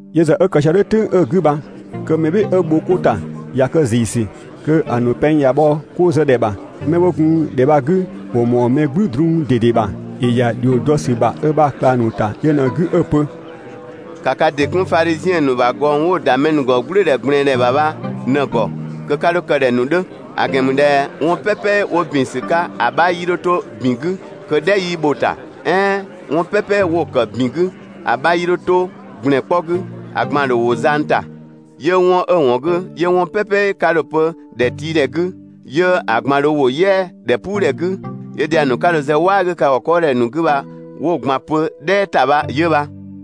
Yö ‑zë 'ö kë sië "dhʋ̈ "tʋ̈ng 'ö‑ 'gü bha kö mɛ "bhɩɩ‑ 'ö bho 'ko ‑ta kö ꞊ya kë ‑ziisü. Kö‑ ‑nu pɛng ꞊ya bhɔ 'ko zë ꞊dhɛ ‑bha. 'Mɛ 'wo gun ‑dhɛ bha‑ 'gü ‑wo ‑mɔɔ mɛ "gblü drun ꞊dede ‑bha. ‑Yö ‑ya ‑dhio dɔ ‑sü ‑bha ö ‑bha ꞊klang ‑nu ‑ta yö ꞊në‑ 'gü 'ö‑ pö: «‑Ka ka ‑dɩ 'kun Fadhiziɛn ‑nu ‑bha ꞊gɔng 'wo‑ ‑da mɛ ‑nu ‑gɔ "gblʋ̈ʋ̈dhɛ ꞊gblɛɛndhɛ ‑bha bha ꞊në‑ ‑gɔ ('kö 'ka 'dho kë ꞊dhɛ‑ ‑nu 'dhö), ‑a ‑gɛn ‑mü ꞊dhɛ 'wɔn "pɛpɛ 'wo ‑bin ‑sü 'ka ‑a 'bha 'yii 'dho 'to ‑bin 'gü kö "dhɛ 'yii bho‑ ‑ta, "ɛɛn 'wɔn "pɛpɛ 'wo‑ ‑kë ‑bin 'gü, ‑a 'bha 'yii 'dho 'to ‑gblɛn 'kpɔ 'gü, ‑a ꞊gban‑ ‑dho ‑wo zang ‑ta. 'Yö 'wɔn 'ö‑ ‑wɔn 'gü 'yö 'wɔn "pɛpɛ 'ka dho‑ pö ‑dhɛtiidhɛ 'gü, 'yö‑ ꞊gban dho ‑wo "yɛa‑ ‑dhɛpuudhɛ 'gü, 'yö dhiang ‑nu 'ka dho‑ zë "waa 'gü ka ‑gɔ 'kɔɔdhɛ ‑nu 'gü bha 'wo‑ ꞊gban pö "dhɛɛ ‑ta bha 'yö bha.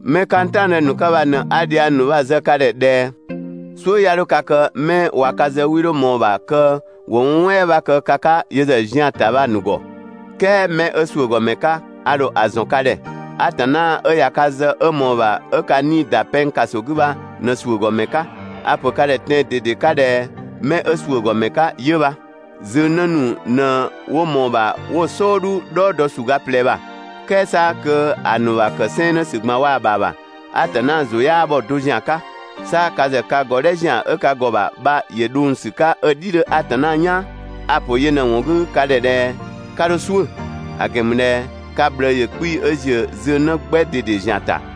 'Mɛ 'ka n "taɔngdë ‑nu 'ka bha ꞊në 'a dhiang ‑nu bha‑ zë ka ‑dhɛ ꞊dhɛ: "Suʋ̈ 'ya 'dho ka kë 'mɛ ꞊wa ka zë 'wii 'dho ꞊mɔɔ‑ ‑bha kö ‑wo 'wɔn "wɛɛ 'bha kë ka 'ka yö ‑zë zian‑ ‑ta bha‑ ‑nu ‑gɔ, "kɛɛ 'mɛ 'ö ‑suʋ̈gɔmɛ 'ka, a ‑dho ‑zɔn ka ‑dhɛ. Atanna 'ö ꞊ya ka zë 'ö ꞊mɔɔ‑ ‑bha 'ö ka 'nii‑ ‑da pɛng ‑kaso 'gü bha ꞊në ‑suʋ̈gɔmɛ 'ka. A‑ ‑pö ka ‑dhɛ tɛan‑ ꞊dede 'ka ꞊dhɛ 'mɛ 'ö ‑suʋ̈ ‑gɔ ‑mɛ 'ka 'yö bha. Zöngnë ‑nu ꞊në 'wo ꞊mɔɔ‑ ‑bha 'wo‑ "sɔɔdhu "dhɔɔ dɔ ‑suga ꞊plɛ ‑bha, "kɛɛ 'sa kö ‑a ‑nu ‑bha ‑kë 'sɛɛnnë ‑sü ꞊gban waa‑ ‑bha ‑bha Atanna ‑zʋ 'yaa bhɔ‑ do ‑zian 'ka. 'Sa ka ‑zë ka ‑gɔdhɛ ‑zian 'ö ka ‑gɔ ‑bha ‑yö dhong‑ ‑sü 'ka 'ö‑ "dhi 'dhö Atanna "yaan. A‑ ‑pö yö ꞊në‑ ‑wɔn 'gü ka ‑dhɛ ꞊dhɛ 'ka 'dho "suʋ̈; ‑a ‑gɛn ‑mü ꞊dhɛ ka ꞊bhlëë ‑yö 'kpii‑ 'ö ‑ziö zöngnë 'gbɛ ꞊dede ‑zian ‑ta.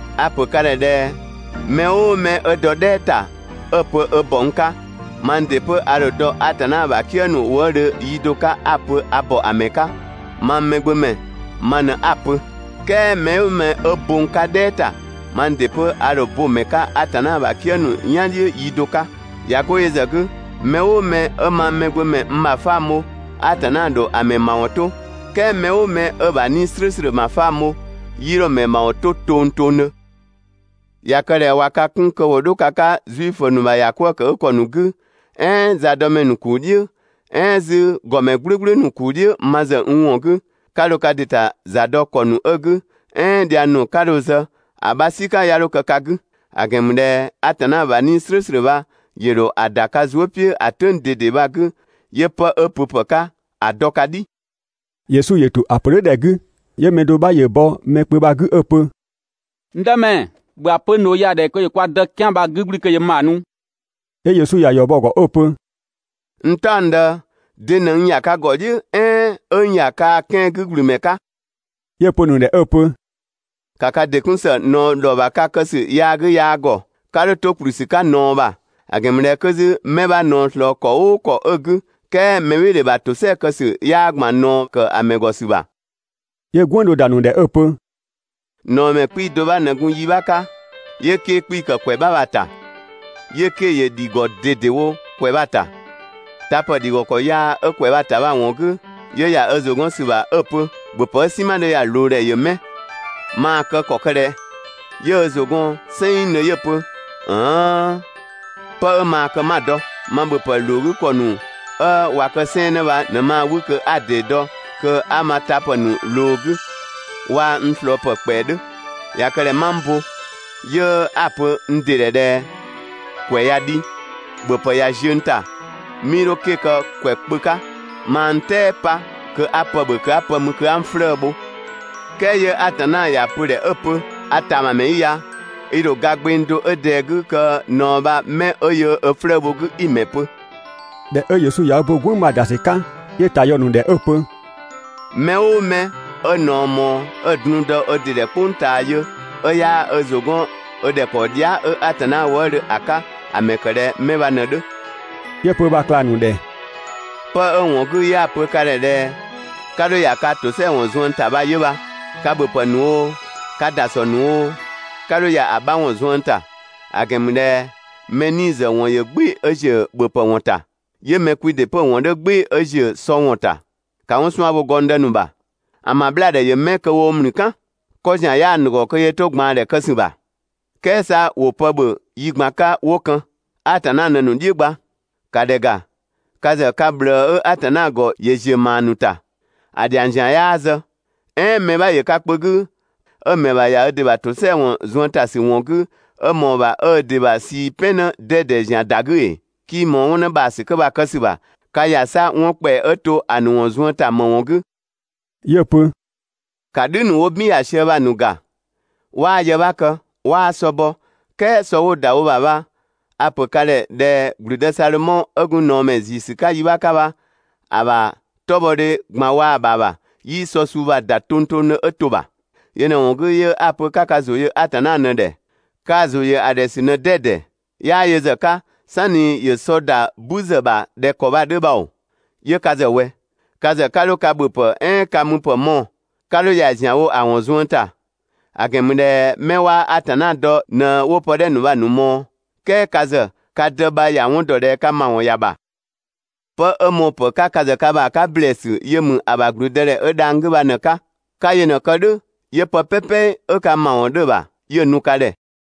A‑ ‑pö ka ‑dhɛ ꞊dhɛ: Mɛ "ʋʋ mɛ 'ö dɔ "dhɛɛ ‑ta 'ö‑ pö ö ‑bɔ n 'ka, mang ‑dɩ 'pö a ‑dho dɔ Atanna ‑bha "kië ‑nu wëëdhö yi do 'ka 'a‑ pö a ‑bɔ ‑a ‑mɛ 'ka, mang Mɛgbömɛ ma ꞊në 'a‑ pö. "Kɛɛ mɛ "ʋʋ mɛ 'ö bo n 'ka "dhɛɛ ‑ta, mang ‑dɩ 'pö a ‑dho bo‑ ‑mɛ 'ka Atanna ‑bha "kië ‑nu "yan "dhiʋ̈ yi do 'ka. ꞊Ya 'go yö ‑zë 'gü, mɛ "ʋʋ mɛ 'ö mang Mɛgbömɛ n ‑bhafang bho, Atanna ‑dho ‑a ‑mɛ ‑mawɔn to, "kɛɛ mɛ "ʋʋ mɛ 'ö‑ ‑bha 'Nii‑ "slʋ̈ʋ̈slʋ̈ ‑bhafang bho, 'yii 'dho‑ ‑mɛ ‑mawɔn 'to tongtongdhö. ꞊Ya kë ꞊dhɛ ꞊wa ka 'kun kö ‑wo 'dho ka 'ka Zuifö ‑nu ‑bha ‑yakwëëkëgükɔ ‑nu 'gü, "ɛɛn zadɔmɛ ‑nu ‑kuu "dhiʋ̈, "ɛɛn 'zü ‑gɔmɛ "gblʋ̈gblʋ̈ ‑nu ‑kuu "dhiʋ̈ (ma ‑zë n ‑wɔn 'gü), 'ka dho ka ‑dɩ ‑ta za dɔ ‑kɔ ‑nu 'ö‑ 'gü, "ɛɛn dhiang ‑nu 'ka dho‑ zë, ‑a 'bha "sika 'ya 'dho kë ka 'gü; ‑a ‑gɛn ‑mü ꞊dhɛ Atanna ‑bha 'Nii‑ "slʋ̈ʋ̈slʋ̈ bha ‑yö ‑dho ‑a ‑da ka zuë" "piʋ̈ ‑a "tʋ̈ng ꞊dede bha‑ 'gü 'yö 'pë 'ö pöpë 'ka ‑a dɔ ka "dhi. Yesu ‑yö ‑to ‑a pö "dhʋ̈ ‑dhɛ 'gü, 'yö mɛ do 'bha ‑yö bɔ mɛ kpö bha‑ 'gü 'ö‑ pö: «N Dëmɛ, ‑bhö ‑a pö n ꞊dhoo ya‑ ‑dhɛ ‑yö kwa dë 'kɛan‑ bha‑ 'gü ‑gblü kö ‑yö n ‑bha nu.» 'Yö Yesu ‑ya ‑yɔ bɔ‑ ‑gɔ 'ö‑ pö: «N "taɔngdë, de ꞊në n ‑ya ka ‑gɔ "dhiʋ̈, "ɛɛn 'ö n ‑ya kaa‑ 'kɛan‑ 'gü ‑gblü ‑mɛ 'ka?» 'Yö‑ pö‑ ‑nu ‑dhɛ 'ö‑ pö: «Ka ka ‑dɩ 'kun ‑së ꞊naɔ ‑dhɔ ‑bha ka kë ‑sü yaa 'gü yaa ‑gɔ, 'ka 'dho 'to ‑kplü ‑sü 'ka ꞊naɔ ‑bha; ‑a ‑gɛn ‑mü ꞊dhɛ 'kö 'zü 'mɛ 'bha ꞊naɔ ꞊slɔɔ ‑kɔ "ʋʋ ‑kɔ 'ö‑ 'gü, "kɛɛ mɛbhɩɩdhe ‑bha ‑tosɛa kë ‑sü 'yaa ‑gban ꞊naɔ ‑kë mɛ ‑gɔ ‑sü ‑bha.» 'Yö "gwënng do ‑da ‑nu ‑dhɛ 'ö‑ pö: «꞊Naɔmɛ 'kpii‑ do 'bha ꞊në gun yi 'bha 'ka, 'yö 'ke‑ 'kpii‑ ‑kë ‑kwɛ 'bha bha‑ ‑ta, 'yö 'ke‑ ‑yö ‑dhi ‑gɔ ꞊dedewo ‑kwɛ bha‑ ‑ta. Tapë ‑dhi ‑gɔ ‑kɔ yaa 'ö ‑kwɛ bha‑ ‑ta bha‑ ‑wɔn 'gü, 'yö ‑ya ö ‑zʋ 'gɔn ‑sü ‑bha 'ö‑ pö: «‑Bhöpë 'ö "sinma 'dhö ya‑ ꞊loo ‑dhɛ ‑yö 'mɛ? Maa‑ kë ‑kɔ kë ꞊dhɛ?» 'Yö ö ‑zʋ gɔn "sɛnngdhö 'yö‑ pö: «‑ën 'hëëën! 'Pë 'ö maa‑ kë 'ma‑ dɔ. Ma ‑bhöpë ‑loo 'gü ‑kɔ ‑nu 'ö ꞊wa kë 'sɛɛnnë bha ꞊në maa‑ 'wü kö 'a ‑dee dɔ kö 'a ma tapë ‑nu ꞊loo‑ 'gü, waa‑ n ꞊slɔɔpë ‑kpɛa 'dhö. ꞊Ya kë ꞊dhɛ 'ma n bo, 'yö 'a‑ pö n ‑dɩ ‑dhɛ ꞊dhɛ: ‑Kwɛ ꞊ya dhi, ‑bhöpë ꞊ya ziö n ‑ta, 'mii 'dho 'ke‑ kë ‑kwɛ kpö 'ka, maa n "tɛɛ pa kö 'a pë ‑bhö kö 'a pë mü kö 'a n 'flëë‑ bho.» "Kɛɛ 'yö Atanna ‑ya pö‑ ‑dhɛ 'ö‑ pö: «A ‑tamamɛ 'i ya! I ‑dho ga gbeng do 'ö ꞊dɛɛ‑ 'gü kö‑ ꞊naɔ bha 'mɛ 'ö yöö ö 'flëë‑ bho‑ 'gü 'i‑ ‑mɛ pö?» ꞊Dhɛ 'ö Yesu ꞊ya ö bo "gwënng bha‑ ‑da ‑sü 'ka, 'yö‑ ‑ta yɔ ‑nu ‑dhɛ 'ö‑ pö: «Mɛ "ʋʋ mɛ 'ö ꞊naɔ ꞊mɔɔ 'ö‑ drung dɔ ö ‑dɩ ‑dhɛ "kpʋng ꞊taa yö, 'ö 'yaa ö ‑zʋ 'gɔn 'ö ‑dhɛkpaɔ dhia" 'ö Atanna wëëdhö ‑a 'ka, ‑a ‑mɛ ‑kë ꞊dhɛ 'mɛ bha ꞊në‑ 'dhö.» 'Yö‑ pö ö ‑bha ꞊klang ‑nu ‑dhɛ: «'Pë 'ö‑ ‑wɔn 'gü 'yö 'a‑ pö ka ‑dhɛ ꞊dhɛ: 'Ka 'dho ‑ya kaa‑ ‑tosɛa ‑wɔn zuën ‑ta bha 'yö bha. Ka ‑bhöpë ‑wɔn ‑nu oo, ka ‑dasɔ ‑wɔn ‑nu oo, 'ka 'dho ‑ya ‑a 'bha ‑wɔn zuën ‑ta. ‑A ‑gɛn ‑mü ꞊dhɛ mɛ 'nii‑ ‑zë ‑wɔn ‑yö "gbɩɩ‑ 'ö ‑ziö ‑bhöpë ‑wɔn ‑ta, 'yö mɛ kwi ‑dɩ 'pö‑ ‑wɔn 'dhö "gbɩɩ‑ 'ö ‑ziö sɔ ‑wɔn ‑ta. ‑Ka 'wɔn 'suan‑ bho gɔngdë ‑nu ‑bha! ‑An ‑bha 'bhlaadhɛ ‑yö 'mɛ kö woo‑ ‑mlü "kan? 'Kɔ ‑zian 'yaa‑ ‑nu ‑gɔ kö yöö 'to‑ ꞊gbaandhɛ kë ‑sü ‑bha. "Kɛɛ 'sa ‑wo pë ‑bhö yi ꞊gban 'ka 'wo kën. Atanna ꞊në‑ ‑nu "dhiʋ̈ gba. ‑Ka ‑dhɛ ‑ga, ka ‑zë ka ꞊bhlëë 'ö Atanna ‑gɔ ‑yö ‑ziö ‑maa ‑nu ‑ta. ‑A ‑dhiang ‑zian 'yaa zë. "Ɛɛn mɛ 'bha ‑yö ka kpö 'gü 'ö‑ ‑mɛ ‑bha ‑ya ö ‑dɩ ‑bha ‑tosɛa ‑wɔn zuën ‑ta ‑sü ‑wɔn 'gü, 'ö ꞊mɔɔ‑ ‑bha 'ö ö ‑dɩ ‑bha ꞊sii "pɛn 'në 'dɛdɛ ‑zian ‑da 'gü ‑ee? 'Kii ꞊mɔɔ 'wɔn 'në ‑bhaasü 'kö bha‑ kë ‑sü ‑bha, ka ‑ya 'sa 'wɔn ‑kpɛa 'ö to ‑a ‑nu zuën ‑ta ‑më ‑wɔn 'gü?» 'Yö‑ pö: «‑Ka "dhü ‑nu 'wo "bin ‑ya sië bha‑ ‑nu ‑ga, 'waa yë 'bha kë, 'waa sɔ bɔ, "kɛɛ sɔ 'wo‑ ‑da wo ‑bha bha a‑ ‑pö ka ‑dhɛ ꞊dhɛ (‑gblüdë) Sadhomɔ 'ö gun ꞊naɔmɛ ‑ziisü 'ka yi 'bha 'ka bha, ‑a ‑bha 'tɔbhɔdhe ꞊gban waa‑ ‑bha ‑bha, 'yii‑ sɔ suu bha‑ ‑da tongtongdhö 'ö to‑ ‑bha. Yö ꞊në‑ ‑wɔn 'gü 'yö 'a‑ pö 'ka ka ‑zʋ yö Atanna ꞊në‑ ‑dhɛ. Kaa‑ ‑zʋ ‑yö ‑a ‑dhɛ ‑sü ꞊në 'dɛdɛ. 'Yaa yö ‑zë 'ka, "sanni ‑yö sɔ ‑da "bü ‑zë ‑bha ꞊dhɛ ‑kɔ bha‑ 'dhö bha ‑oo, 'yö ka ‑zë ꞊wɛ? Ka ‑zë 'ka 'dho ka ‑bhöpë "ɛɛn ka müpë mɔɔ‑, 'ka 'dho ‑ya ‑zianwo ‑a ‑wɔn zuën ‑ta; ‑a ‑gɛn ‑mü ꞊dhɛ 'mɛ 'waa Atanna dɔ ꞊në 'wo pë 'dhɛ ‑nu bha‑ ‑nu ꞊mɔɔ. "Kɛɛ ka ‑zë, ka Dë bha ‑ya 'wɔn ‑dɔ ꞊dhɛ ka ‑mawɔn ‑ya ‑bha. 'Pë 'ö mɔɔpë 'ka ka ‑zë ka ‑bha 'ka ‑blɛɛsü yö ‑mü ‑a ‑bha ‑gblüdëdhɛ 'ö dhang‑ 'gü bha ꞊në‑ 'ka, 'ka yö ꞊në‑ kë "dhʋ̈ 'yö pë "pɛpɛ 'ö ka ‑mawɔn 'dhö‑ ‑bha, 'yö‑ nu ka ‑dhɛ.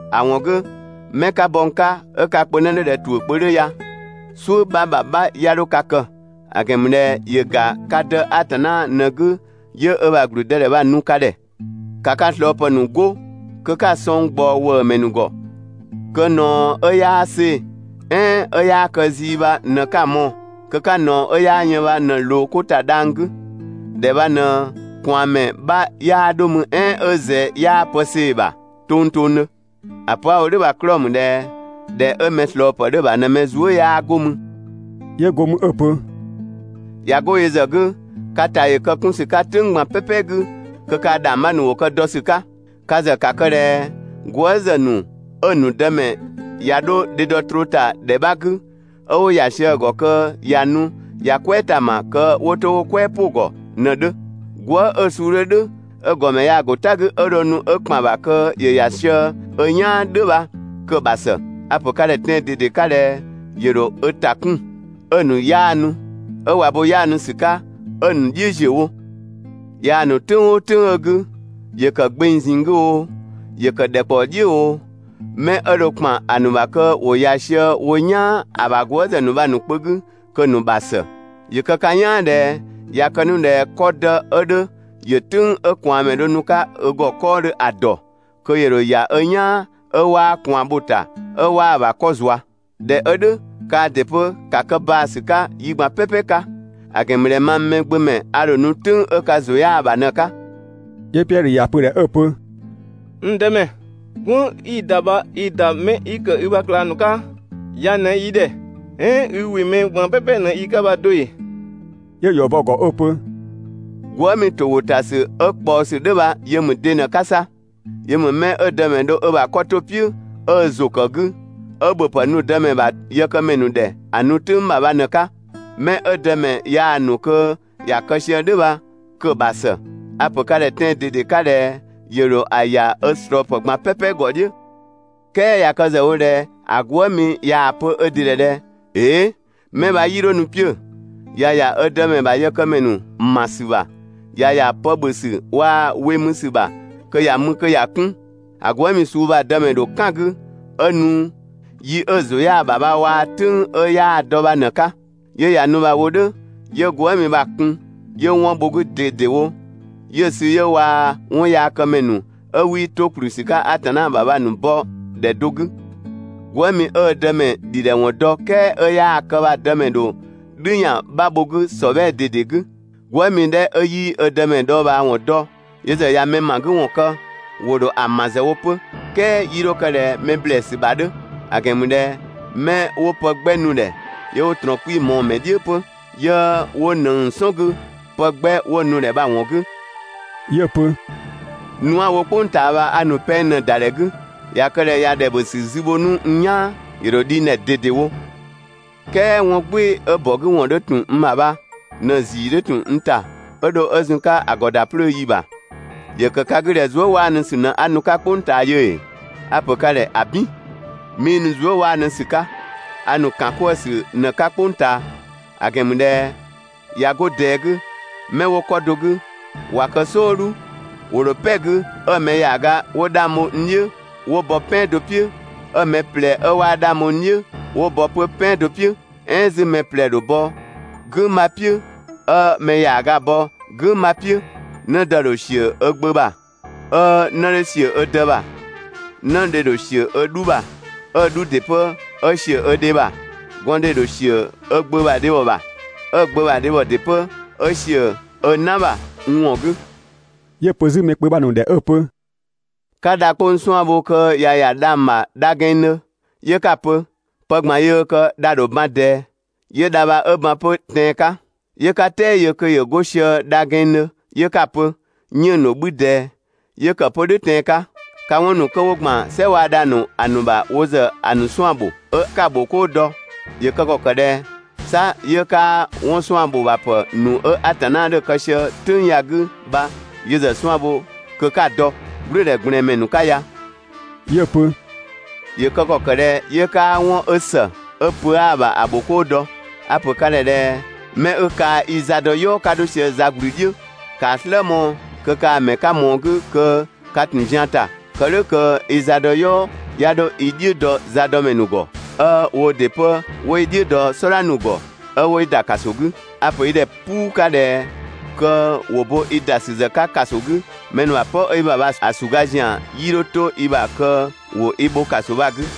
‑A ‑wɔn 'gü, 'mɛ 'ka bɔ n 'ka 'ö ka kpö 'në 'dhö ꞊dhɛ ‑tuʋ̈ kpö 'dhö ya, "suʋ̈ 'bha ‑bha 'bha 'ya 'dho ka kë! ‑A ‑gɛn ‑mü ꞊dhɛ ‑yö ‑ga ka Dë Atanna ꞊në‑ 'gü 'yö ö ‑bha ‑gblüdëdhɛ bha‑ nu ka ‑dhɛ. ‑Ka ka ꞊slɔɔpë ‑nu 'go kö 'ka‑ sɔng ꞊gbaɔ ‑wëëmɛ ‑nu ‑gɔ kö ꞊naɔ 'ö 'yaa see‑, "ɛɛn 'ö 'yaa kë zii bha ꞊në 'ka‑ mɔɔ‑, kö 'ka ꞊naɔ 'ö 'yaa yën bha ꞊në‑ ꞊loo 'ko ‑ta dhang‑ 'gü. ‑Dhɛ bha ꞊në ꞊kwaanmɛ 'bha 'yaa 'dho mü "ɛɛn 'ö ꞊zɛ 'yaa pë see‑ ‑bha tongtongdhö. ‑A pö 'a‑ wo "dhʋ̈ bha‑ 'klɔɔ‑ ‑mü ꞊dhɛ ‑dhɛ 'ö mɛ ꞊slɔɔpë 'dhö‑ ‑bha ꞊në mɛ zuë" 'yaa 'go mü.» 'Yö go mü 'ö‑ pö: «꞊Ya 'go yö ‑zë 'gü, ka ‑ta ‑yö kë 'kun ‑sü 'ka "tʋ̈ng ꞊gban "pɛpɛ 'gü kö kaa‑ ‑dhangbha ‑nu ‑wo kë dɔ ‑sü 'ka. Ka ‑zë ‑ka kë ꞊dhɛ gwëëzë ‑nu 'ö‑ ‑nu Dëmɛ ꞊ya 'dho dhedɔ troo ‑ta ‑dhɛ 'bha 'gü, 'ö 'wo ‑ya sië‑ ‑gɔ kö ꞊ya nu ꞊ya "kwɛɛ ‑ta ‑ma kö ‑wo 'to ‑wo "kwɛɛ "pʋ‑ ‑gɔ ꞊në‑ 'dhö. Gwëë" 'ö suu 'dhö "dhʋ̈ 'ö‑ ‑gɔmɛ yaa‑ ‑go "ta 'gü 'ö dho nu 'ö ‑kpan ‑bha kö ‑yö ‑ya sië ö "yaan "dhʋ̈ bha kö‑ ‑bha ‑së. A‑ ‑pö ka ‑dhɛ tɛan‑ ꞊dede 'ka ꞊dhɛ ‑yö ‑dho ö ‑ta kun 'ö‑ ‑nu 'yaanu. 'Ö ꞊wa bo 'yaanu ‑sü 'ka 'ö‑ ‑nu "dhiʋ̈ ‑ziö wo. Yaa‑ ‑nu "tʋ̈ng "ʋʋ "tʋ̈ng 'ö‑ 'gü, ‑yö ‑kë gbeng ꞊zinng 'gü oo, ‑yö ‑kë ‑dhɛkpaɔ "dhiʋ̈ oo, 'mɛ 'ö dho ‑kpan ‑a ‑nu ‑bha kö ‑wo ‑ya sië wo "yaan ‑a ‑bha gwëëzë ‑nu bha‑ ‑nu kpö 'gü, kö‑ ‑nu ‑bha ‑së. ‑Yö kë ka "yaan ꞊dhɛ ꞊ya kë 'nu ꞊dhɛ 'kɔdë 'ö 'dhö ‑yö "tʋ̈ng 'ö ꞊kwaanmɛ dho nu‑ 'ka ö ‑gɔ 'kɔɔdhö ‑a ‑dɔ, kö ‑yö ‑dho ‑ya ö "yaan 'ö 'waa ꞊kwaan bho‑ ‑ta 'ö 'waa‑ ‑bha 'kɔ zua. ꞊Dhɛ 'ö "dhʋ̈, kaa ‑dɩ 'pö ‑ka kë baa‑ ‑sü 'ka yi ꞊gban "pɛpɛ 'ka; ‑a ‑gɛn ‑mü ꞊dhɛ mang Mɛgbömɛ a ‑dho nu "tʋ̈ng 'ö ka ‑zʋ 'yaa‑ ‑bha ꞊në‑ 'ka.» 'Yö Piɛdhö ‑ya pö‑ ‑dhɛ 'ö‑ pö: «N Dëmɛ, "gwënng 'i‑ ‑da bha i‑ ‑da 'mɛ 'yi ‑kë i ‑bha ꞊klang ‑nu 'ka ya ꞊në yi ‑dhɛ, "ɛɛn i ‑wɩ mɛ ꞊gban "pɛpɛ ꞊në yi 'ka bha do ‑ee?» 'Yö‑ ‑yɔ bɔ‑ ‑gɔ 'ö‑ pö: «Gwëëmi ‑towʋtasü 'ö ꞊kpaɔsü "dhʋ̈ bha yö ‑mü de ꞊në‑ 'ka 'sa? Yö ‑mü 'mɛ 'ö‑ Dëmɛ dho ö ‑bha 'kɔ 'to‑ "piʋ̈ 'ö ö ‑zʋ ‑kë 'gü, 'ö ‑bhöpë nu‑ dëmɛ ‑bha yëkëmɛ ‑nu ‑dhɛ ‑a nu "tʋ̈ng ‑bha bha ꞊në‑ 'ka. 'Mɛ 'ö‑ dëmɛ yaa‑ ‑nu kö ‑ya kë sië "dhʋ̈ bha kö‑ ‑bha ‑së. A‑ pö ka ‑dhɛ tɛan‑ ꞊dede 'ka ꞊dhɛ ‑yö ‑dho ‑a ‑ya ö ꞊slɔɔpë ꞊gban "pɛpɛ ‑gɔ "dhiʋ̈. "Kɛɛ ꞊ya kë ‑zë wo ꞊dhɛ ‑a gwëëmi ꞊yaa‑ pö ö ‑dɩ ‑dhɛ ꞊dhɛ: «‑Ee', 'mɛ bha 'yii 'dho nu 'piö‑, ꞊ya ‑ya ö dëmɛ ‑bha yëkëmɛ ‑nu ‑ma ‑sü ‑bha, ꞊ya ‑ya pë ‑bhö ‑sü waa‑ we mü ‑sü ‑bha, kö ‑ya mü kö ‑ya 'kun, ‑a gwëëmi suu bha‑ dëmɛ ‑dho "kan‑ 'gü 'ö nu yi 'ö‑ ‑zʋ 'yaa‑ ‑bha waa‑ "tʋ̈ng 'ö 'yaa‑ dɔ bha ꞊në‑ 'ka. 'Yö ꞊ya nu bha‑ wo "dhʋ̈ 'yö‑ gwëëmi bha‑ kun 'yö 'wɔn bho‑ 'gü ꞊dedewo, 'yö‑ sü 'yö waa‑ 'wɔnyaakëmɛ ‑nu 'ö 'wii 'to ‑kplü ‑sü 'ka Atanna ‑bha bha‑ ‑nu bɔ ‑dhɛ do 'gü, Gwëëmi 'ö ö dëmɛ ‑dhidhɛwɔn dɔ "kɛɛ 'ö 'yaa‑ kë bha‑ dëmɛ ‑dho "dhü ‑yan 'bha bho‑ 'gü ‑sɔbhɛɛ ꞊dede 'gü. Gwëëmi 'dhɛ 'ö 'yii ö Dëmɛ dhɔɔbhaawɔn dɔ, yö ‑zë ꞊ya mɛ ‑ma 'gü ‑wɔn kë, ‑wo ‑dho ‑a ‑ma ‑zë wo 'pö, "kɛɛ 'yii 'dho kë ꞊dhɛ mɛ ‑blɛɛsü ‑bha 'dhö; ‑a ‑gɛn ‑mü ꞊dhɛ 'mɛ 'wo pë 'gbɛ nu‑ ‑dhɛ, 'yö 'wo ꞊trɔɔn 'kpii‑ mɔɔ‑ ‑mɛ "dhiʋ̈ 'pö, 'yö 'wo ꞊nëng‑ "sɔn 'gü pë 'gbɛ 'wo‑ nu‑ ‑dhɛ bha‑ ‑wɔn 'gü.» 'Yö‑ pö: «Nu 'a‑ wo "kpʋng ꞊taa bha a ‑nu pɛng ꞊në ‑da ‑dhɛ 'gü. ꞊Ya kë ꞊dhɛ ꞊ya ‑dhɛ ‑bhö ‑sü zü bho 'nu n "yaan ‑yö ‑dho dhi n ‑dhɛ ꞊dedewo! "Kɛɛ 'wɔn "gbɩɩ‑ 'ö ‑bɔ 'gü ‑wɔn 'dhö ‑tun n ‑bha bha ꞊në‑ ‑zii 'dhö ‑tun n ‑ta 'ö dho 'ö zun‑ 'ka ‑a ‑gɔ ‑da 'plöö ‑yi ‑bha! ‑Yö ‑kë ka 'gü ꞊dhɛ zuëwaanusü ꞊në 'a nu‑ 'ka "kpʋng ꞊taa yö ‑ee? A‑ ‑pö ka ‑dhɛ ‑abin! 'Mii nu zuëwaanusü 'ka, a ‑nu ‑kankwëësü ꞊në‑ 'ka "kpʋng ꞊taa. ‑A ‑gɛn ‑mü ꞊dhɛ ꞊ya 'go ꞊dɛɛ 'gü, 'mɛ 'wo 'kɔ do 'gü ꞊wa kë "sɔɔdhu, ‑wo ‑dho "pɛ 'gü 'ö mɛ ‑yaaga 'wo 'dhang bho n "dhiʋ̈ 'wo bɔ "pɛan do "piʋ̈, 'ö‑ mɛ ꞊plɛ 'ö 'waa 'dhang bho n "dhiʋ̈ 'wo bɔ 'pö "pɛan do "piʋ̈, "ɛɛn 'zü mɛ ꞊plɛ‑ ‑dho bɔ "gʋ̈ng 'bha "piʋ̈, 'ö mɛ ‑yaaga bɔ "gʋ̈ng 'bha "piʋ̈. 'Nëdë ‑dho ‑siö ö gbö ‑bha, 'ö 'në 'dhö ‑siö ö dë ‑bha. 'Nëdhe ‑dho ꞊sië ö 'dhu ‑bha, 'ö‑ 'dhu ‑dɩ 'pö 'ö ‑siö ö dhe ‑bha. Gɔndhe ‑dho ‑siö ö gbö ‑bha dhebhɔ ‑bha, 'ö‑ gbö ‑bha dhebhɔ ‑dɩ 'pö 'ö ‑siö ö "na ‑bha (n ‑wɔn 'gü).» 'Yö‑ pö 'zü mɛ kpö bha‑ ‑nu ‑dhɛ 'ö‑ pö: «'Ka dha 'kpong‑ 'suan‑ bho kö ꞊ya ‑ya dhang‑ ‑bha dha gɛnngdhö, 'yö 'ka‑ pö: «Pë ꞊gban yöö kë, dha ‑dho ban ꞊dɛɛ», 'yö dha bha ö ban 'pö tɛan‑ 'ka. 'Yö 'ka "tɛɛ yö kö ‑yö 'go sië dha gɛnngdhö 'yö 'ka‑ pö: «'Yënng‑ ‑dho 'bhü ꞊dɛɛ», 'yö kë 'pö "dhʋ̈ tɛan‑ 'ka. Ka 'wɔn ‑nu kö 'wo ‑gban "sɛ waa‑ dhang‑ ‑nu ‑a ‑nu ‑bha wo ‑zë ‑a ‑nu 'suan‑ ‑bho, 'ö 'ka‑ ‑bhokoo dɔ, ‑yö kë ‑kɔ ‑kë ꞊dhɛ 'sa 'yö 'kaa 'wɔn 'suan‑ ‑bho ‑bha pë ‑nu 'ö Atanna 'dhö‑ kë sië "tʋ̈ng ya‑ 'gü bha yö ‑zë 'suan‑ bho kö 'ka‑ dɔ, "gblʋ̈ʋ̈dhɛ ꞊gblɛɛn ‑mɛ ‑nu 'ka ya! ‑Yö kë ‑kɔ kë ꞊dhɛ 'yö 'kaa 'wɔn 'ö ‑së, 'ö pö 'aa‑ ‑bha ‑a ‑bhokoo dɔ? A‑ ‑pö ka ‑dhɛ ꞊dhɛ: 'Mɛ 'ö kaa‑ i za dɔ "yɔɔ 'ka 'dho sië za ꞊gblü "dhiʋ̈, ‑kaa "slë mɔɔ‑ kö kaa‑ ‑mɛ 'ka mɔɔ‑ 'gü kö ka ‑tun zian ‑ta, kë "dhʋ̈ kö i za dɔ "yɔɔ 'ya 'dho i "dhiʋ̈ dɔ zadɔmɛ ‑nu ‑gɔ, 'ö woo ‑dɩ 'pö 'wo i "dhiʋ̈ dɔ "sɔdha ‑nu ‑gɔ, 'ö 'wo i ‑da ‑kaso 'gü. A‑ ‑pö i ‑dhɛ "puu 'ka ꞊dhɛ kö ‑wo bo i ‑da ‑sü ‑zë 'ka ‑kaso 'gü, mɛ ‑nu ‑bha "pɔ 'ö i ‑bha bha‑ ‑suga ‑zian 'yii dho 'to i ‑bha kö ‑wo i bho ‑kaso bha‑ 'gü.»